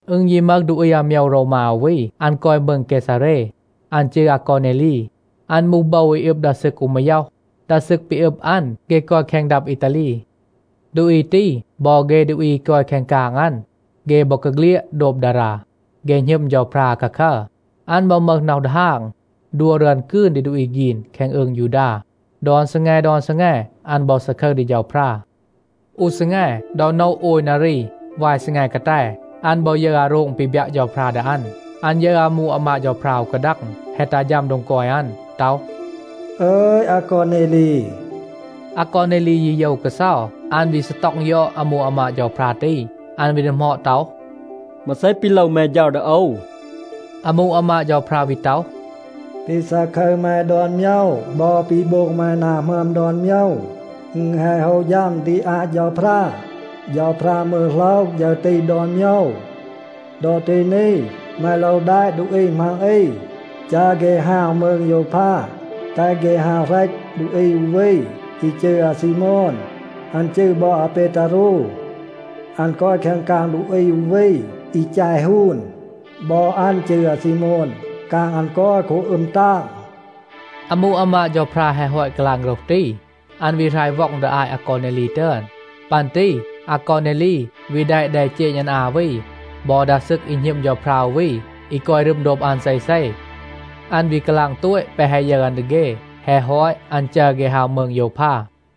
อึณ ยี มึห ดูอี อาโมยว โรวมา อู วี, อัน กอย มืง เกซาเร. อัน จืร อากอเนลี. อัน มูห โบว อี อึบ ดา ซึก อู มาย็อห. ดา ซึก ปี อึบ อัน, เฆ กอย แคง ดับ อีตาลี. ดูอี ตี บอ เฆ ดูอี อี กอย แคง กาง อัน, เฆ บอกาเฆลียด โดบ ดารา. เฆ หณึม เฌาพรา อาคาคัร. อัน บอ มึห น็อห ดีฮาง, ดัว รึอน กืน ดี ดูอี ฆีน แคง อืง ยูดา. ดอน ซีแง, ดอน ซีแง อัน บอ ซาคึร ดี เฌาพรา. อู ซีแง, ดอ โนะ โอย นารี วาย ซีแง กาแต, อัน บอ ยึร อาโรง ปี บยัะ เฌาพรา ดี อัน. อัน ยึร อามู อามาด เฌาพรา อู กาดัง, แฮะ ตัห ฌัม โดง กอย อัน ต็อห, “อึย, อากอเนลี.” อากอเนลี ยี โยว กาเซา. อัน วี ซีต็อง ยอด อามู อามาด เฌาพรา ตี. อัน วี ดีหมอด ต็อห, “มาเซ ปี โลว แม เฌา ดี โอว?” อามู อามาด เฌาพรา วี ต็อห, “ปี ซาคึร แม ดอน โมยว บอ ปี โบง แม นา หมึอม ดอน โมยว, อึณ แฮะ โฮะ ฌัม ดี อาต เฌาพรา. เฌาพรา มืร โหลห ฌึร ตี ดอน โมยว. ดอ ตี นี, แม โลว แดะ ดูอี มัง อี, จัร เฆ ฮาว มืง โยวพา, แตห เฆ ฮาว เหรต ดูอี อู วี, อี จืร อาซีโมน. อัน จืร บอ อาเปตารู. อัน กอย แคง กาง ดูอี อู วี อี แจ ฮูน. บอ อัน จืร อาซีโมน. กาง อัน กอย โคบ อึม ตาง.” อามู อามาด เฌาพรา แฮะ ฮอต กาลาง โฆรห ตี, อัน วี หราย ว็อง ดี อาต อากอเนลี ตึอน. ปัน ตี อากอเนลี วี แดะ แดเจณ อัน อา วี บอ ดา ซึก อี หณึม เฌาพรา อู วี, อี กอย รึม โดบ อัน เซเซ. อัน วี กาลาง โตต แปะ แฮะ ยึร อัน ดี เฆ. แฮะ ฮอต, อัน จัร เฆ ฮาว มืง โยวพา.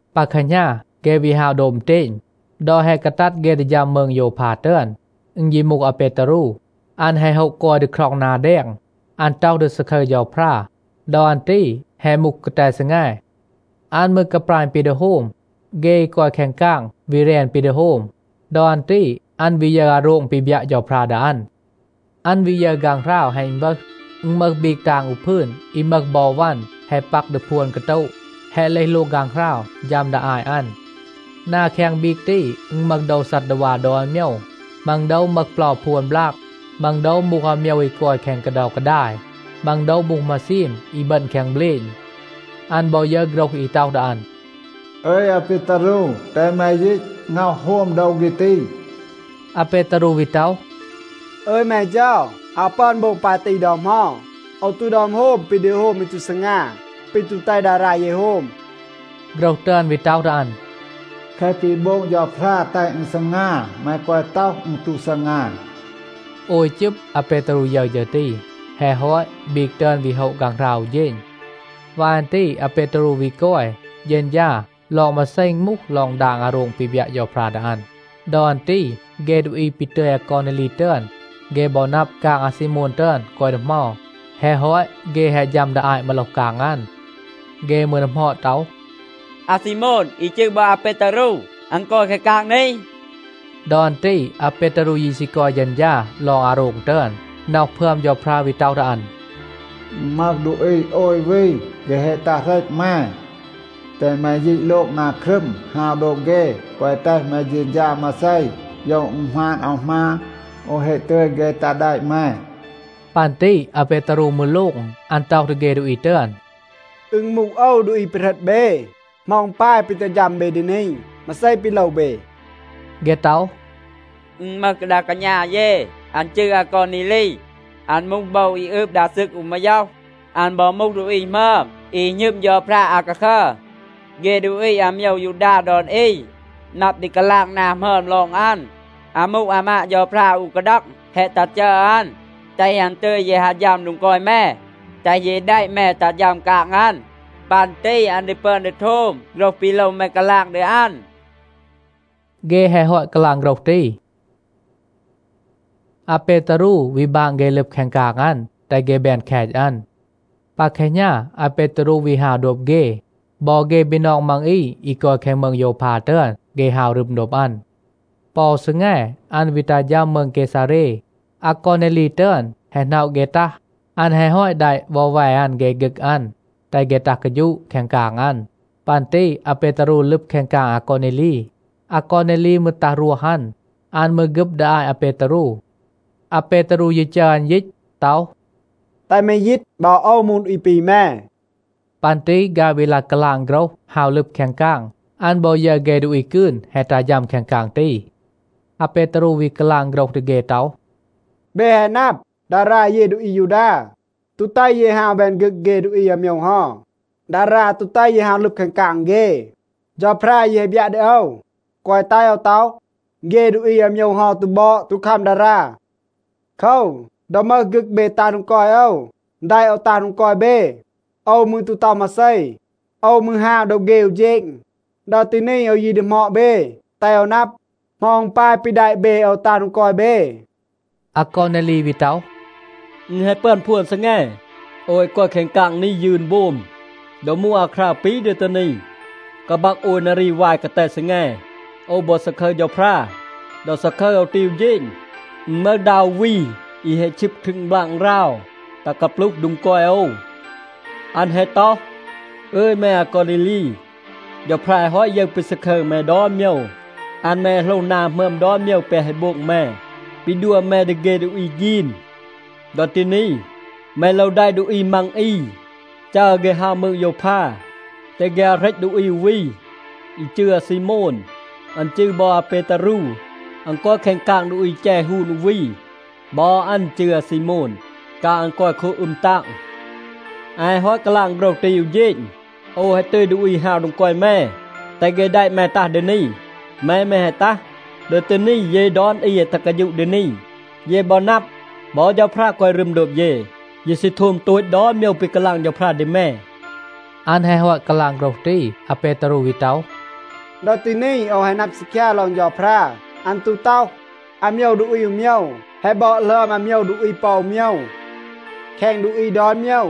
ปา แคหณา เฆ วี ฮาว โดบ อึณเตณ. ดอ แฮะ กาตัด เฆ ดี ฌัม มืง โยวพา ตึอน, อึณ ยี มูห อาเปตารู. อัน แฮะ โฮะ กอย ดี คร็อง นา แดง. อัน ต็อห ดี ซาคึร เฌาพรา. ดอ อัน ตี แฮะ มูห กาแต ซีแง. อัน มืร กาปราณ ปี ดี โฮม. เฆ อี กอย แคง กาง วี แรน ปี ดี โฮม. ดอ อัน ตี อัน วี ยึร อาโรง ปี บยัะ เฌาพรา ดี อัน. อัน วี ยึร ฆางหราว แฮะ อึณวึห. อึณ มึห บีก ตาง อู พืน อี มึห บอ วัน แฮะ ปัก ดี พวน กาโตะ, แฮะ เลห โลง ฆางหราว, ฌัม ดี อาต อัน. นา แคง บีก ตี, อึณ มึห โดว ซัดดาวา ดอน โมยว. มัง โดว มึห เปลา พวน บลาก. มัง โดว มูห อาโมยว อี กอย แคง กาเดา กาดาย. มัง โดว มูห มาซีม อี บึณ แคง เบลณ. อัน บอ ยึร โฆรห อี ต็อห ดี อัน, “อึย อาเปตารู, แตห แม ยีต, ง็อห โฮม โดว เฆ ตี.” อาเปตารู วี ต็อห, “อึย แม เฌา, อาว ปึอน โบง ปาย ตี ดอ เหมา. โอว ตู ดึอม โฮม ปี ดี โฮม อี ตู ซีงา, ปี ตู แตห ดารา เย โฮม.” โฆรห ตึอน วี ต็อห ดี อัน, “แคะ ปี โบง เฌาพรา แตห อึณ ซีงา, แม แกวะ ต็อห, อึณ ตู ซีงา.” โอย จึบ อาเปตารู ยึร ฌึร ตี. แฮะ ฮอต, บีก ตึอน วี โฮะ ฆางหราว อู เฌณ. วาย อัน ตี อาเปตารู วี กอย, เฌณฌา ลอง มาเซ อึณ มูห ลอง ดาง อาโรง ปี บยัะ เฌาพรา ดี อัน. ดอ อัน ตี เฆ ดูอี ปี ตึย อากอเนลี ตึอน, เฆ บอ นับ, กาง อาซีโมน ตึอน กอย ดี เหมา. แฮะ ฮอต เฆ แฮะ ฌัม ดี อาต มาโลห กาง อัน. เฆ มืร ดีหมอด ต็อห, “อาซีโมน อี จืร บอ อาเปตารู, อัน กอย แคง กาง นี?” ดอ อัน ตี อาเปตารู ยี ซี กอย เฌณฌา ลอง อาโรง ตึอน, น็อห พึอม เฌาพรา วี ต็อห ดี อัน, “อึณ มึห ดูอี โอย วี, เฆ แฮะ ตัห, เหรต แม. แตห แม ยีต โลง นา ครึม, ฮาว โดบ เฆ. แกวะ แตห แม เฌณฌา มาเซ, โยว อึณ หมาน อาว หมาน. โอว แฮะ ตึย เฆ ตัห แดะ แม.” ปัน ตี อาเปตารู มืร โลง. อัน ต็อห ดี เฆ ดูอี ตึอน, “อึณ มูห โอว, ดูอี ปี เหรต เบ. เหมา อึณ ปาย, ปี ตัห ฌัม เบ ดี นี? มาเซ ปี โลว เบ?” เฆ ต็อห, “อึณ มึห ดา กาณา เย, อัน จืร อากอเนลี. อัน มูห โบว อี อึบ ดา ซึก อู มาย็อห. อัน บอ มูห ดูอี หมึอม, อี หณึม เฌาพรา อาคาคัร. เฆ ดูอี อาโมยว ยูดา ดอน อี นับ ดี กาลาง นา หมึอม ลอง อัน. อามู อามาด เฌาพรา อู กาดัง แฮะ ตัห จัร อัน, แตห อัน ตึย เย ฮาว ฌัม โดง กอย แม, แตห เย แดะ แม ตัห ฌัม กาง อัน. ปัน ตี อัน ดี ปึอน ดี โทม โฆรห ปี โลว แม กาลาง ดี อัน.” เฆ แฮะ ฮอต กาลาง โฆรห ตี, อาเปตารู วี บาง เฆ ลึบ แคง กาง อัน, แตห เฆ แบน แคต อัน. ปา แคหณา อาเปตารู วี ฮาว โดบ เฆ. บอ เฆ บีนอง มัง อี, อี กอย แคง มืง โยวพา ตึอน, เฆ ฮาว รึม โดบ อัน. ปอ อู ซีแง อัน วี ตัห ฌัม มืง เกซาเร. อากอเนลี ตึอน แฮะ หน็อะ เฆ ตัห. อัน แฮะ ฮอต แดะ วอแว อัน เฆ ฆึก อัน, แตห เฆ ตัห กาฌูะ แคง กาง อัน. ปัน ตี อาเปตารู ลึบ แคง กาง อากอเนลี. อากอเนลี มืร ตัห รวห อัน. อัน มืร ฆึบ ดี อาต อาเปตารู. อาเปตารู ยี จัร อัน ยีต ต็อห, “แตห แม ยีต. บอ โอว มูห ดูอี ปี แม.” ปัน ตี ฆาย วี ลาย กาลาง โฆรห, ฮาว ลึบ แคง กาง. อัน บอ ยึร เฆ ดูอี กืน แฮะ ตัห ฌัม แคง กาง ตี. อาเปตารู วี กาลาง โฆรห ดี เฆ ต็อห, “เบ แฮะ นับ, ดารา เย ดูอี อายูดา ตู แตห เย ฮาว แบน ฆึก เฆ ดูอี อาโมยว เฮา. ดารา ตู แตห เย ฮาว ลึบ แคง กาง เฆ. เฌาพรา ยี แฮะ บยัะ ดี โอว, แกวะ แตห โอว ต็อห, เฆ ดูอี อาโมยว เฮา ตู บอด, ตู คัม ดารา. โคว, ดอ มึห ฆึก เบ ตัห โดง กอย โอว, แดะ โอว ตัห โดง กอย เบ, โอว มืร ตู ต็อห มาเซ. โอว มืร ฮาว โดบ เฆ อู เฌณ. ดอ ตี นี โอว ยี ดีหมอด เบ, แตห โอว นับ, เหมา อึณ ปาย ปี แดะ เบ โอว ตัห โดง กอย เบ?” อากอเนลี วี ต็อห, “อึณ แฮะ ปึอน พวน ซีแง, โอว แฮะ กอย แคง กาง นี, ยืน โบม. ดอ มูห อาคราว ปี ดอ ตี นี, กาบัก โอย นารี วาย กาแต ซีแง, โอว บอ ซาคึร เฌาพรา. ดอ ซาคึร โอว ตี อู เฌณ, อึณ มึห ดา อู วี อี แฮะ ชึบ ครึง บลาง ราว ตัห กาปลูห โดง กอย โอว. อัน แฮะ ต็อห, ‘อึย แม อากอเนลี, เฌาพรา แฮะ ฮอต ยึร ปี ซาคึร แม ดอน โมยว. อัน มืร แฮะ โหลห นา หมึอม ดอน โมยว แปะ แฮะ โบง แม, ปี ดัว แม ดี เฆ ดูอี ฆีน. ดอ ตี นี, แม โลว แดะ ดูอี มัง อี, จัร เฆ ฮาว มืง โยวพา, แตห เฆ ฮาว เหรต ดูอี อู วี, อี จืร อาซีโมน. อัน จืร บอ อาเปตารู. อัน กอย แคง กาง ดูอี แจ ฮูน อู วี. บอ อัน จืร อาซีโมน. กาง อัน กอย โคบ อึม ตาง.’ อัน แฮะ ฮอต กาลาง โฆรห ตี อู เฌณ โอว แฮะ ตึย ดูอี ฮาว โดง กอย แม, แตห เฆ แดะ แม ตัห ดี นี. แม มืร แฮะ ตัห. ดอ ตี นี เย ดอน อี แฮะ ตัห กาฌูะ ดี นี. เย บอ นับ, บอ เฌาพรา กอย รึม โดบ เย. เย ซี โทม โตต ดอน โมยว ปี กาลาง เฌาพรา ดี แม.” อัน แฮะ ฮอต กาลาง โฆรห ตี, อาเปตารู วี ต็อห, “ดอ ตี นี โอว แฮะ นับ ซีคยา ลอง เฌาพรา. อัน ตู ต็อห, อาโมยว ดูอี อู โมยว แฮะ บอด หลึอม อาโมยว ดูอี ปอ อู โมยว. แคง ดูอี ดอน โมยว,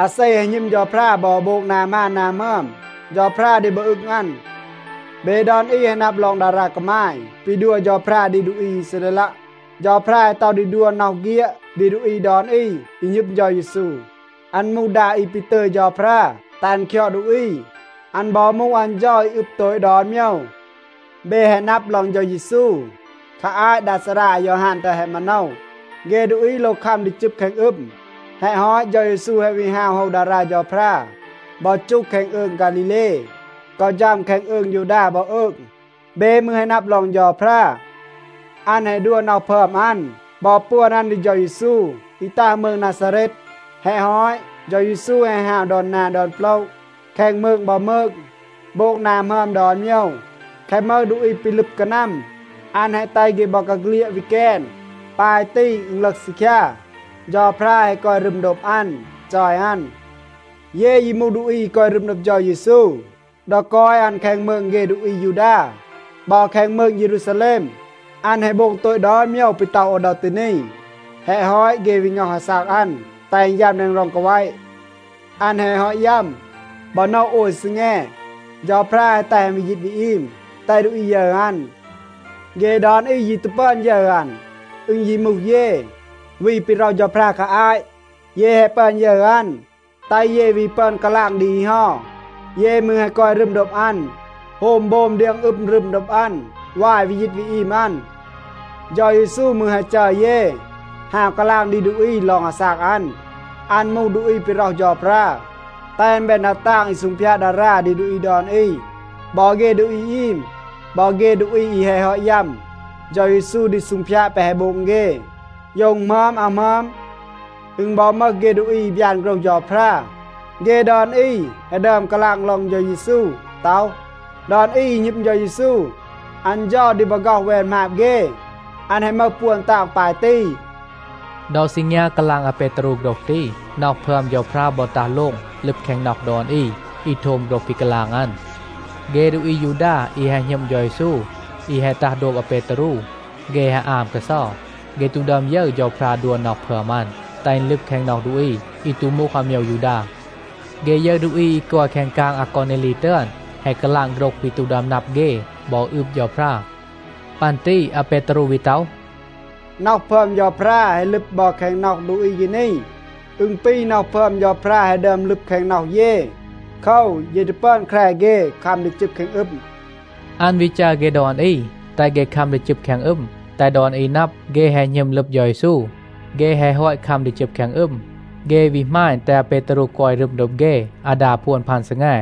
อาเซ แฮะ หณึม เฌาพรา บอ โบง นา หมาน นา หมึอม, เฌาพรา ดี บอ อึง อัน. เบ ดอน อี แฮะ นับ ลอง ดารา กามาย ปี ดัว เฌาพรา ดี ดูอี อีซาเรลัะ. เฌาพรา แฮะ ต็อห ดี ดัว น็อห เฆียด ดี ดูอี ดอน อี, อี หณึม เฌา เยซู. อัน มูห ดา อี ปี ตึย เฌาพรา แตห อัน คยอด ดูอี. อัน บอ มูห อัน เฌา อี อึบ โตต ดอน โมยว. เบ แฮะ นับ ลอง เฌา เยซู. คา อาต ดา ซารา อายอฮาน ตึอน แฮะ มาโนว, เฆ ดูอี โลว คัม ดี จึบ แคง อึม. แฮะ ฮอต, เฌา เยซู แฮะ วี ฮาว โฮว ดารา เฌาพรา บอ จูห แคง อืง ฆาลีเล กอ ฌัม แคง อืง ยูดา บอ อืง. เบ มืร แฮะ นับ ลอง เฌาพรา. อัน แฮะ ดัว น็อห พึอม อัน บอ ปวน อัน ดี เฌา เยซู, อี ตัห มืง นาซาเรต. แฮะ ฮอต, เฌา เยซู แฮะ ฮาว ดอน นา ดอน โปละ แคง มืง บอ มืง, โบง นา หมึอม ดอน โมยว. แคะ มึห ดูอี ปี ลึบ กานัม, อัน แฮะ แตห เฆ บอกาเฆลียด วี แกน. ปาย ตี อึณ ลึห ซีคยา, เฌาพรา แฮะ กอย รึม โดบ อัน, จอย อัน. เย ยี มูห ดูอี อี กอย รึม โดบ เฌา เยซู. ดอ กอย อัน แคง มืง เฆ ดูอี อายูดา บอ แคง มืง เยรูซาแลม อัน แฮะ โบง โตต ดอน โมยว ปี ต็อห โอว ดอ ตี นี. แฮะ ฮอต, เฆ วี ง็อห อาซาก อัน, แตห อัน ยัม แดง ร็อง กาแวะ. อัน แฮะ ฮอต ยัม, บอ โนะ โอย ซีแง, เฌาพรา แฮะ แตห อัน วี ยีต วี อีม, แตห ดูอี ยึร อัน. เฆ ดอน อี ยี ตู ปึอน ยึร อัน. อึณ ยี มูห เย, วี ปี ร็อห เฌาพรา คา อาต. เย แฮะ ปึอน ยึร อัน, แตห เย วี ปึอน กาลาง ดี อี เฮา. เย มืร แฮะ กอย รึม โดบ อัน, โฮม โบม, เดียง อึม รึม โดบ อัน วาย วี ยีต วี อีม อัน. เฌา เยซู มืร แฮะ จัร เย ฮาว กาลาง ดี ดูอี ลอง อาซาก อัน. อัน มูห ดูอี ปี ร็อห เฌาพรา, แตห อัน แบน ดา ตาง อี ซูงพยาด ดารา ดี ดูอี ดอน อี. บอ เฆ ดูอี อีม, บอ เฆ ดูอี อี แฮะ ฮอต ยัม, เฌา เยซู ดี ซูงพยาด แปะ แฮะ โบง เฆ, โยว อึณ หมึอม, อาว หมึอม. อึณ บอ มึห เฆ ดูอี อี บยาน โฆรห เฌาพรา, เฆ ดอน อี แฮะ ดึอม กาลาง ลอง เฌา เยซู ต็อห, ‘ดอน อี, อี หณึม เฌา เยซู, อัน เฌา ดี บอ ฆ็อห แวน หมาบ เฆ. อัน แฮะ มึห ปวน ตาง ปาย ตี.’” ดอ ซีงยา กาลาง อาเปตารู โฆรห ตี, น็อห พึอม เฌาพรา บอ ตัห โลง ลึบ แคง น็อห ดอน อี, อี โทม โฆรห ปี กาลาง อัน. เฆ ดูอี อายูดา อี แฮะ หณึม เฌา เยซู, อี แฮะ ตัห โดบ อาเปตารู, เฆ แฮะ อาม กาเซา. เฆ ตู ดึอม ยึร เฌาพรา ดัว น็อห พึอม อัน, แตห อึณ ลึบ แคง น็อห ดูอี, อี ตู มูห อาโมยว ยูดา. เฆ ยึร ดูอี อี กอย แคง กาง อากอเนลี ตึอน, แฮะ กาลาง โฆรห ปี ตู ดึอม นับ เฆ บอ อืบ เฌาพรา. ปัน ตี อาเปตารู วี ต็อห, “น็อห พึอม เฌาพรา แฮะ ลึบ บอ แคง น็อห ดูอี เฆ นี. อึณ ปี น็อห พึอม เฌาพรา แฮะ ดึอม ลึบ แคง น็อห เย. โคว, เย ตู ปึอน แคร เฆ คัม ดี จึบ แคง อึม.” อัน วี จัร เฆ ดอน อี, แตห เฆ คัม ดี จึบ เฆ แคง อึม, แตห ดอน อี นับ, เฆ แฮะ หณึม ลึบ เฌา เยซู. เฆ แฮะ ฮอต คัม ดี จึบ แคง อึม, เฆ วี หมาณ, แตห อาเปตารู กอย รึม โดบ เฆ อาดา พวน พัน ซีแง.